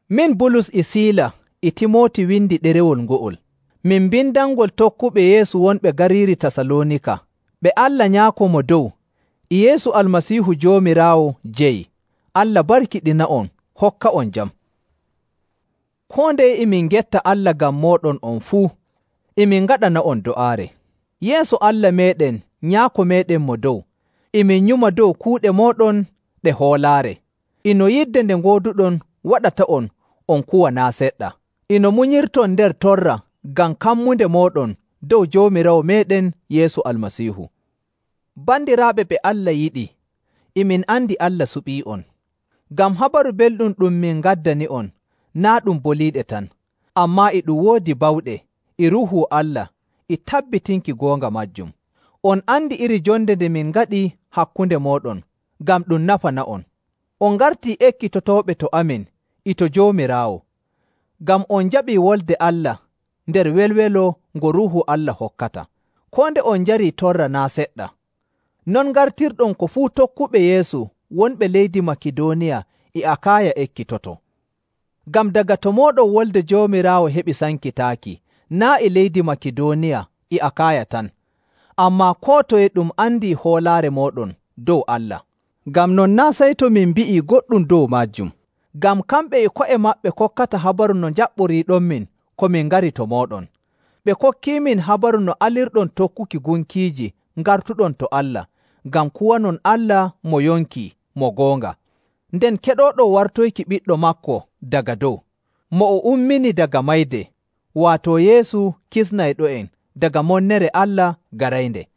Min Bulus e Siila e Timooti windi ɗerewol ngo'ol. Min mbindanngol tokkuɓe Yeesu wonɓe gariiri Tasaloonika ɓe Allah Nyaako Mo Dow e Yeesu Almasiihu Joomiraawo jeyi. Allah barkiɗina'on hokka'on jam. Koo ndeye e min ngetta Allah ngam mooɗon on fuu, e min ngaɗana'on do'aare. Yeeso Allah meeɗen Nyaako meeɗen Mo Dow, e min nyuma dow kuuɗe mooɗon ɗe hoolaare, e no yidde nde ngooduɗon waɗata'on on kuwa naa' seɗɗa, e no munyirton nder torra ngam kammunde mooɗon dow Joomiraawo meeɗen Yeesu Almasiihu. Bandiraaɓe ɓe Allah yiɗi, e min andi Allah suɓii'on. Ngam Habaru Belɗum ɗum min ngaddani'on naa' ɗum boliiɗe tan, ammaa e ɗum woodi bawɗe, e Ruuhu Allah, e tabbitinki goonga maajum. On andi iri jonde nde min ngaɗi hakkunde mooɗon ngam ɗum nafana'on. On ngartii ekkitotooɓe to amin e to Joomiraawo, ngam on njaɓii Wolde Allah nder welwelo ngo Ruuhu Allah hokkata, koo nde on njarii torra naa' seɗɗa. Non ngartirɗon ko fuu tokkuɓe Yeesu wonɓe leydi Makidooniya e Akaaya ekkitotoo. Ngam daga to mooɗon wolde Joomiraawo heɓi sankitaaki naa' e leydi Makidooniya e Akaaya tan, ammaa koo toye ɗum andii hoolaare mooɗon dow Allah. Ngam non naa' sey to min mbi'ii goɗɗum dow maajum. Ngam kamɓe e ko'e maɓɓe kokkata habaru no njaɓɓoriiɗonmin ko min ngari to mooɗon. Ɓe kokkiimin habaru no alirɗon tokkuki gunkiiji ngartuɗon to Allah, ngam kuwanon Allah mo yonki mo goonga, nden keɗooɗon wartoyki Ɓiɗɗo maako daga dow, mo o ummini daga mayde, waato Yeesu kisnayɗo'en daga monnere Allah garaynde.